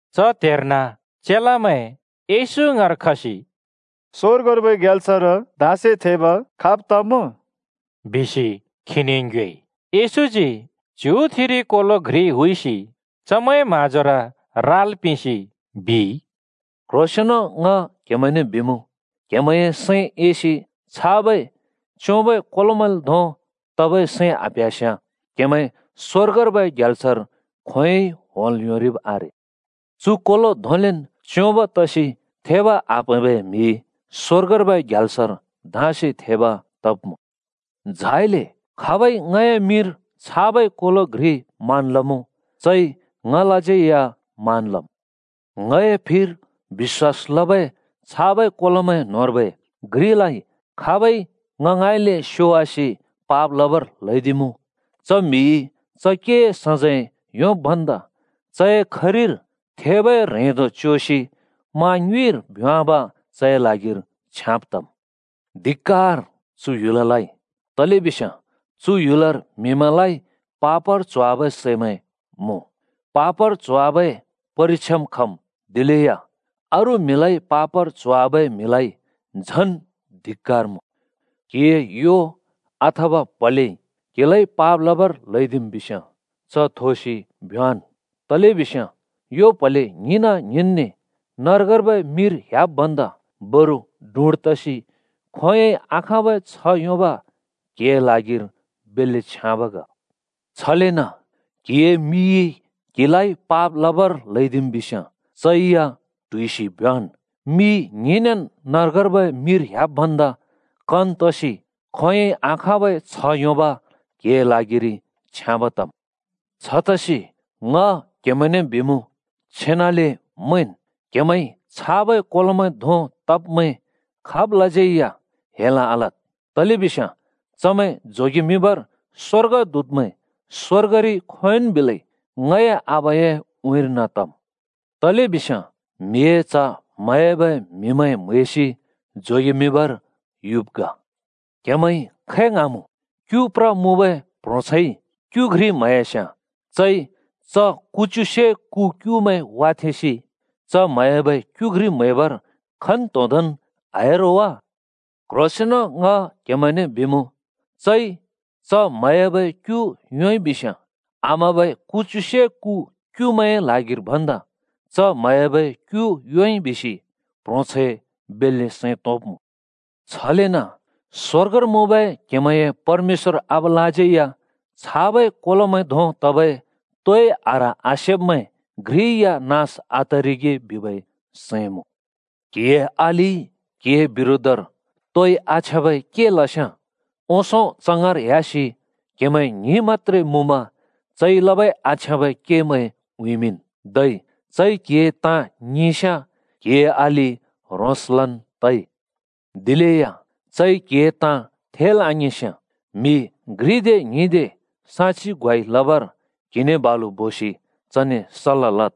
च त्हेर्न चेलामैं येशू ङाँर खसि “स्‍वर्गर्बै ग्याल्सर धाँसे थेब खाब् तमुँ?” बिसि खीने ङ्योएइ। येशूजी च्‍युथिरि कोलो घ्रि हुइसि चमैंए म्हाँजोर राल् पिंसि बिइ, “क्ह्रोंसेंन्ले ङ क्हेमैंने बिमुँ, क्‍हेमैंए सैं एसि छाबै च्‍योंबै कोलोमैंल् धों तबै सैं आप्‍ह्‍यास्याँ क्‍हेमैं स्‍वर्गर्बै ग्याल्सर खोंयोंइ होंल् योंरिब् आरे। चु कोलो धोंलेन् च्‍योंब तसि थेब आप्‍हैंबै म्‍हि स्‍वर्गर्बै ग्याल्सर धाँसे थेब तब्मुँ। झाइले खाबइ ङए मिंर छाबै कोलो घ्रि मान लमुँ, चइ ङलाज्यै या मान लम्। “ङए फिर बिश्‍वास लबै छाबै कोलोमैं न्होंर्बै घ्रिलाइ खाबइ ङ ङाँइँले स्‍योवासि पाप लबर ल्हैदिमुँ, च म्हिइ च केए सजैं योंब् भन्दा चए खरिर थेबै ह्रेंदो च्‍योसि मा ङ्युँइर भ्‍योंवाब चए ल्हागिर छ्याँब तम्। धिक्‍कार चु ह्‍युललाइ! तलेबिस्याँ चु ह्‍युलर म्‍हिमैंलाइ पापर च्होवाबै सैमैं मुँ। पापर च्होवाबै परिक्षाम् खम्, दिलेया अरू म्हिलाइ पापर च्होवाबै म्हिलाइ झन धिक्‍कार मुँ। “क्‍हिए यो अथवा प्‍हलेइ क्‍हिलाइ पाप लबर ल्हैदिम् बिस्‍याँ च थोसि भ्‍योंवाँन्। तलेबिस्याँ यो प्‍हले ङ्हिंना ङ्हिंन्‍ने नर्गर्बै मिर ह्‍याब् भन्दा बरु डुँड तसि खोंयोंइ आखाँबै छ्ह योंब क्‍हिए ल्हागिर बेल्‍ले छ्याँब ग। छलेन क्‍हिए मिइ क्‍हिलाइ पाप लबर ल्हैदिम् बिस्याँ चै या ट्हुइसि भ्‍योंवाँन्। मि ङ्हिंनेन् नर्गर्बै मिर ह्‍याब् भन्दा कन तसि खोंयोंइ आखाँबै छ्ह योंब क्‍हिए ल्हागिरि छ्याँब तम्। “छतसि ङ क्हेमैंने बिमुँ, छेनाले मैंन्! क्हेमैंइ छाबै कोलोमैं धों तब्‍मैं खाबलाज्यै या हेल आलद्। तलेबिस्याँ चमैं जोगेमिंबर स्‍वर्गदूतमैं स्‍वर्गरि खोंयोंन् बिलै ङए आबाए उँइँर्न तम्। [तलेबिस्याँ म्हिए च्ह म्हयाबै म्हिमैं म्हैसि जोगेमिंबर युब् ग।] “क्‍हेमैंइ खै ङ्हाँमुँ? क्‍यु प्र मुँबै प्‍ह्रोंछैंइ क्‍यु घ्रि म्‍हयास्‍याँ चइ च कुच्युसे कु क्युमैं वाथेंसि च म्‍हयाबै क्‍यु घ्रि म्‍हैबर खन्तोंदोंन् आह्‍या रो वा? क्ह्रोंसेंन ङ क्हेमैंने बिमुँ, चइ च म्‍हयाबै क्‍यु योंइ बिस्याँ आम्‍हबै कुच्युसे कु क्युमैंए ल्हागिर भन्दा च म्हयाबै क्यु योंइ बिसि प्‍ह्रोंछैं बेल्‍ले सैं तोंब्मुँ। छलेन स्‍वर्गर मुँबै क्हेमैंए परमेश्‍वर आबालाज्यै या छाबै ङए फिर बिश्‍वास लबै कोलोमैं न्होंर घ्रि या नास आतरिगे बिबै सैं मुँ। “क्‍हिए अलिइ क्‍हिए बिरोधर तोइ आछ्याँबै के लस्‍याँ, ओंसों च ङाँर ह्‍यासि क्हेमैं ङ्हिं मत्‍त्रे मुँमा चइ लबै आछ्याँबै केमैं उँइँमिंन्। धै चइ क्‍हिए ताँ ङिंस्‍याँ, क्‍हिए अलि ह्रोंसलन् तइ। दिलेया चइ क्‍हिए ताँ थेल् आङिंस्‍याँ म्‍हि घ्रिदे ङ्हिंदे साक्षि ग्वाइ लबर क्‍हिने बालु बोसि चने सल्‍ला लद्।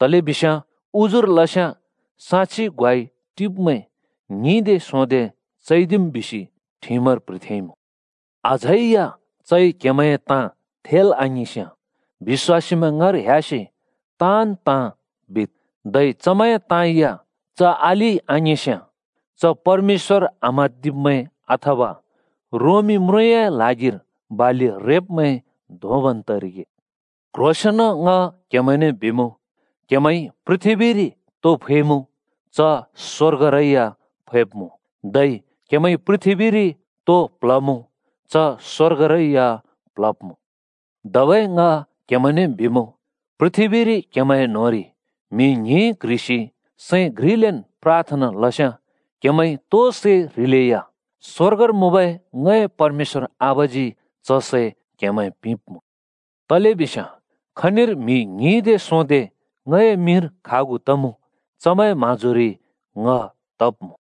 तलेबिस्याँ ‘उजुर लस्‍याँ साक्षि ग्वाइ टिब्‍मैं ङ्हिंदे सोंदे चैदिम्,’ बिसि ठिमर प्‍ह्रिथेंइमुँ। अझै या चइ क्‍हेमैंए ताँ थेल् आङिंस्‍याँ बिश्‍वासीमैं ङाँर ह्‍यासि ताँन् ताँ बिद्। धै चमैंए ताँ या च अलिइ आङिंस्‍याँ च परमेश्‍वर आम्हाँदिब्मैं अथवा रोमी म्रुँए ल्हागिर बालि रेब्‍मैं धोंबन् तरिगे। “क्ह्रोंसेंन ङ क्हेमैंने बिमुँ, क्‍हेमैंइ पृथ्‍बीरि तो फैमुँ, च स्वर्गरै या फैब्मुँ। धै क्‍हेमैंइ पृथ्‍बीरि तो प्ल्हमुँ, च स्‍वर्गरै या प्ल्हब्‍मुँ। धबै ङ क्हेमैंने बिमुँ, पृथ्‍बीरि क्‍हेमैंए न्‍होंरि म्‍हि ङ्हिं क्ह्रिसि सैं घ्रिलेन् प्राथना लस्याँ क्हेमैंइ तो सै ह्रिलेया स्‍वर्गर मुँबै ङए परमेश्‍वर आबाजी च सै क्हेमैं पिंब्‍मुँ। तलेबिस्याँ खनिर म्‍हि ङ्हिदे सोंदे ङए मिंर खागु तमुँ, चमैंए म्‍हाँजोरि ङ तब्‍मुँ।”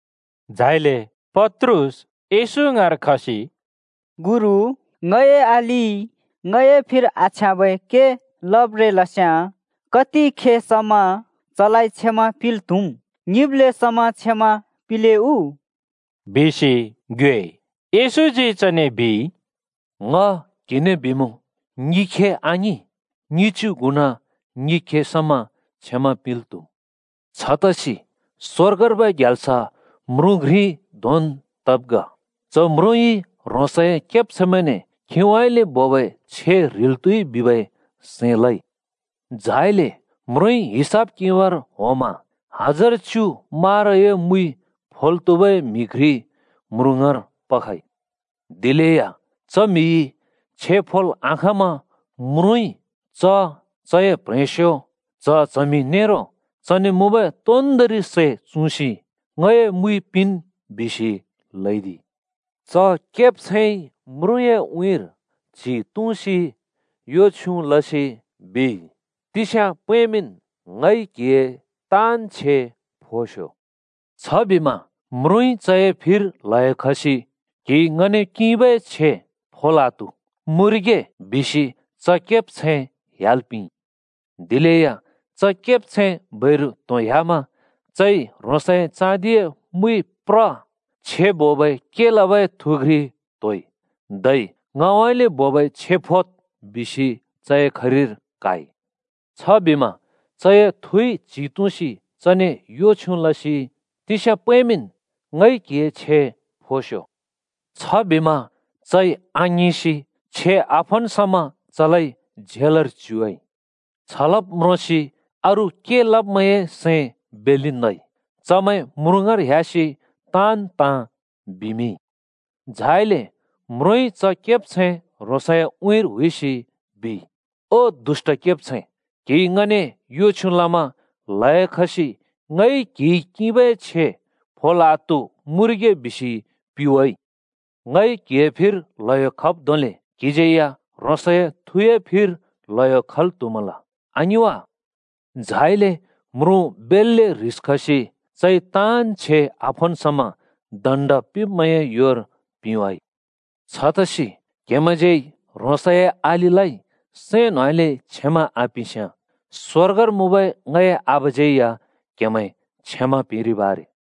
झाइले पत्रुस येशू ङाँर खसि “गुरु, ङए अलिइ ङए फिर आछ्याँबै के लब्रें लस्‍याँ कति खे समा चलाइ क्षमा पिंल् त्‍हुम्? ङिब्‍ले समा क्षमा पिंले उ?” बिसि ङ्योएइ। येशूजी चने बिइ, “ङ क्हिने बिमुँ, ङिखे आङिं, ङिच्‍यु गुणा ङिखे समा क्षमा पिंल् त्‍हुम्! छतसि स्‍वर्गर्बै ग्याल्स म्रुँ घ्रि धोंन् तब् ग। च म्रुँइ ह्रोंसए केब्छैंमैंने खीउँइँले बोबै छे ह्रिल् त्हुइ बिबै सैं लइ। झाइले म्रुँइ हिसाब किंबर होंमा हजार च्‍यु माराए मुइ फोल् त्‍हुबै म्हि घ्रि म्रुँ ङाँर पखइ। दिलेया च म्‍हिइ छे फोल् आखाँमा म्रुँइ ‘च, चए प्ह्रेंस्यो, च्‍ह-चमि नेरो चने मुँबै तोन्दोंरि सै चुँसि ङए मुइ पिंन्,’ बिसि ल्हैदिइ। “च केब्छैंइ म्रुँए उँइँर च्‍हि तुँसि यो छ्युँ लसि ‘तिस्या पैंमिंन्, ङइ क्हिए ताँन् छे फोस्‍यो,’ बिइ। “छबिमा म्रुँइ चए फिर ल्‍हयो खसि ‘क्हिइ ङने किंबै छे फोल् आत्हु! मुँरिगे!’ बिसि च केब्छैं ह्‍याल् पिंइ। “दिलेया च केब्छैं बैरु त्होंह्‍यामा चइ ह्रोंसए चाँदिए मुइ प्र छे बोबै के लबै थु घ्रि त्होइ। धै ‘ङउँइँले बोबै छे फोद्’ बिसि चए खरिर क्हाइ। “छबिमा चए थुइ च्‍हि तुँसि चने यो छ्युँ लसि ‘तिस्या पैंमिंन्, ङइ क्‍हिए छे फोस्‍यो,’ बिइ। छबिमा चइ आङिंसि छे आफोन् समा चलाइ झेलर च्युवाइ। “छ लब् म्रोंसि अरू के लब्मैंए सैं बेल्‍ले नइ। चमैं म्रुँ ङाँर ह्‍यासि ताँन् ताँ बिवाइ। झाइले म्रुँइ च केब्छैं ह्रोंसए उँइँर हुइसि बिइ, ‘ओ दुष्‍ट केब्छैं! क्‍हिइ ङने यो छ्युँ लमा ल्हयो खसि ङइ क्‍हिइ किंबै छे फोल् आत्हु मुँरिगे बिसि पिवाइ! ङइ क्‍हिए फिर ल्हयो खब् धोंले क्‍हिज्यै या ह्रोंसए थुए फिर ल्हयो खल् त्‍हुमल आङिं वा?’ झाइले म्रुँ बेल्‍ले ह्रिस खसि ‘चइ ताँन् छे आफोन् समा दण्ड पिंब्मैंए योर पिंवाँइ।’ “छतसि क्‍हेमैंज्यै ह्रोंसए अलिलाइ सैं न्‍होंउँइँले क्षमा आपिंस्याँ, स्‍वर्गर मुँबै ङए आबाज्यै या क्‍हेमैं क्षमा पिंरिब् आरे।”